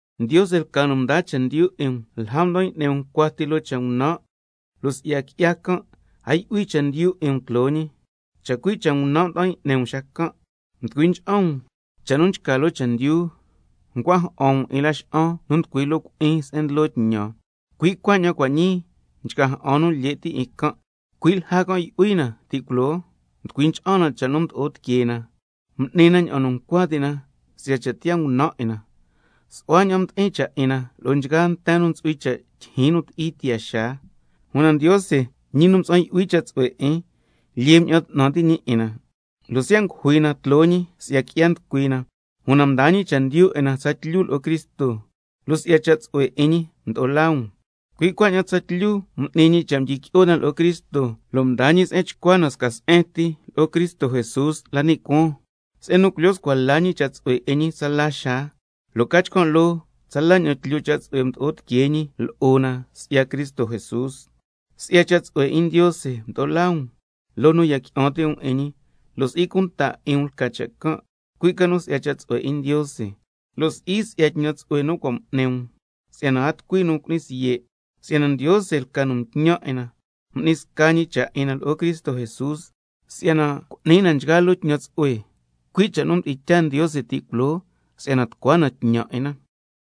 Ndiose lca nu mdaa chendyu 'in um lja mda'an y'ni um cuati loo cha' ngunan', lo' si'ya qui'ya can' a yu'hui chendyu 'in um tloo ñi. Chacui' cha' ngunan' mda'an y'ni um xacan', mducui ncha'an um cha' nu nchca loo chendyu, ncua ja'an um 'in laxa'an nu nducui loo cui'in se'en ndlo tñan, lo' nchgaa nu lye' ti' nchca ja'an 'in can', cui' lja can' yu'hui na ti' culoo, mducui ncha'an na cha' nu mdo'o tiquee na, m'ni na ña'an nu ncua ti' na si'ya cha' tiyaa ngunan' 'in na, lo' su'hua ña'an mdi'in cha' 'in na lo'o nchgaa nten nu ntsu'hui cha' tyijyin nu ti'i tiyaa xaa. Una Ndiose, ñi nu mtsa'an yu'hui cha' tsu'hue 'in, lyee mña'an 'tnan ti' ñi 'in na, lo' siya' ngujui na tloo ñi si'ya qui'ya nducui na, una mdaa ñi chendyu 'in na tsatlyu lo'o Cristo, (lo' si'ya cha' tsu'hue 'in ñi mdo'o laa um), cui' cuaña'an tsatlyu m'ni ñi cha' mdyiqui'o na lo'o Cristo, lo' mdaa ñi se'en chcua na sca se'en ti lo'o Cristo Jesús la ni' cuaan, se'en nu culyo scua la ñi cha' tsu'hue 'in ñi tsala xaa, lo' ca chcan' loo tsala ña'an tlyu cha' tsu'hue mdo'o tiquee ñi lo'o na si'ya Cristo Jesús. Si'ya cha' tsu'hue 'in Ndiose mdo'o laa um loo nu ya qui'an ti' um 'in ñi, lo' si'i cunta 'in um lca cha' can', cui' ca nu si'ya cha' tsu'hue 'in Ndiose ti, lo' si'i si'ya tñan tsu'hue nu cua' m'ni um, si'yana a tucui nu cu'ni siye'. Si'yana Ndiose lca nu mtñan 'in na, m'ni sca ñi cha' 'in na lo'o Cristo Jesús si'yana cu'ni na nchgaa loo tñan tsu'hue, cui' cha' nu mdi'in tyaa Ndiose ti' culoo si'yana tucua na tñan 'in na.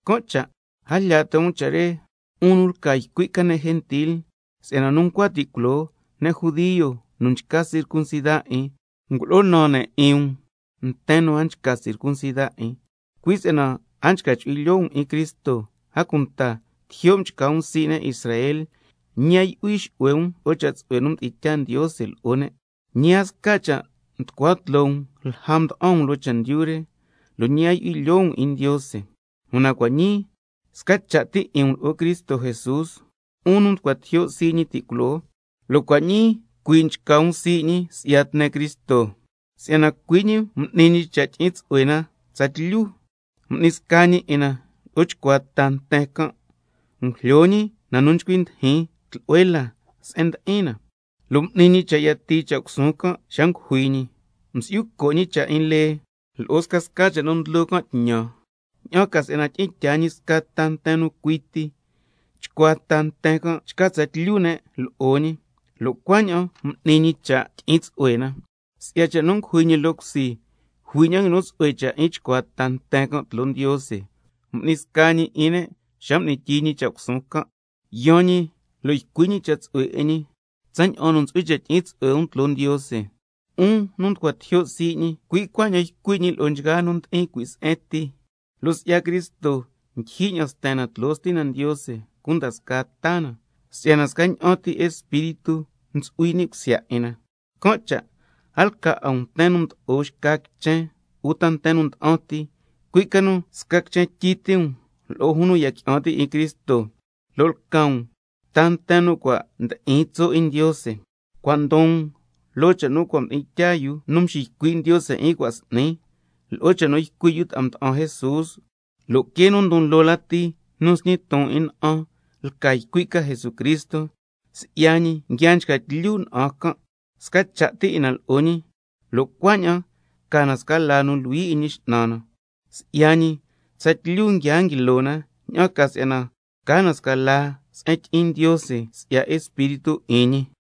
Can' cha' a jlya ti' um cha' re, 'un nu lca ycui' ca ne' gentil, si'yana nu ncua ti' culoo ne' judio nu nchca circuncida 'in ngulo'o naan ne' 'in um nten nu a nchca circuncida 'in, cui' si'yana a nchca chu'hui lyoo um 'in Cristo, a cunta tijyo' mchca um sii' ne' Israel, ñi a yu'hui xu'hue um lo'o cha' tsu'hue nu mdi'in tyaa Ndiose lo'o ne', ñi a sca cha' mducua tloo um lja mda'an um loo chendyu re, lo' ñi a yu'hui lyoo um 'in Ndiose. Una cua' ñii sca cha' ti 'in um lo'o Cristo Jesús, 'un nu mducua tijyo' sii' ñi ti' culoo, lo' cua' ñii cuii' nchca um sii' ñi si'ya tne Cristo. Si'yana cui' ñi m'ni ñi cha' tyi'in tsu'hue na tsatlyu, m'ni sca ñi 'in na lo'o chcuaa ta nten can', ngujlyo ñi na nu ngui'ni tucui tlu'hue la se'en ndi'in na, lo' m'ni ñi cha' yatii cha' cusuun can' xa ngujui ñi, msi'yu co' ñi cha' 'in lee lo'o scasca cha' nu ndlo can' tñan, ña'an ca si'yana tyi'in tyaa ñi sca ta nten nu cui ti, chcuaa ta nten can' chca tsatlyu ne' lo'o ñi, lo' cuaña'an m'ni ñi cha' tyi'in tsu'hue na. Si'ya cha' nu ngujui ñi loo cusi, jui ña'an nguinu tsu'hue cha' 'in chcuaa ta nten can' lo'o Ndiose, m'ni sca ñi 'in ne' xa m'ni tyii ñi cha' cusuun can'. Yaan ñi lo' ycui' ñi cha' tsu'hue 'in ñi tsaña'an nu ntsu'hui cha' tyi'in tsu'hue um tloo Ndiose, —'un nu mducua tijyo' sii' ñi, cui' cuaña'an ycui' ñi lo'o nchgaa nu ndi'in cui' se'en ti—, lo' si'ya Cristo ndyijyi ña'an sten na tloo Stina Ndiose cunda scaa ta na, si'yana scaña'an ti Espíritu ntsu'hui ni' cusya 'in na. Can' cha' a lca 'a um nten nu mdo'o xca quichen uta nten nda'an ti, cui' ca nu sca quichen tyi ti um lo'o jun nu ndiya qui'an ti' 'in Cristo, lo' lca um ta nten nu cua' ndi'in tso' 'in Ndiose. Cua' ndon um loo cha' nu cua' mdi'in tyaa yu nu mxiycui' Ndiose 'in cua' s'ni, lo'o cha' nu ycui' yu ta'a mda'an Jesús, lo' quee nu ndon loo lati nu nsñi ton 'in na'an lca ycui' ca Jesucristo. Si'ya ñi nguia nchca tlyu na'an can', sca cha' ti 'in na lo'o ñi, lo' cuaña'an ca na sca laa nu luhui 'in Ñi X'nan na. Si'ya ñi tsatlyu nguia nguilo na, ña'an ca si'yana ca na sca laa se'en tyi'in Ndiose si'ya Espíritu 'in ñi.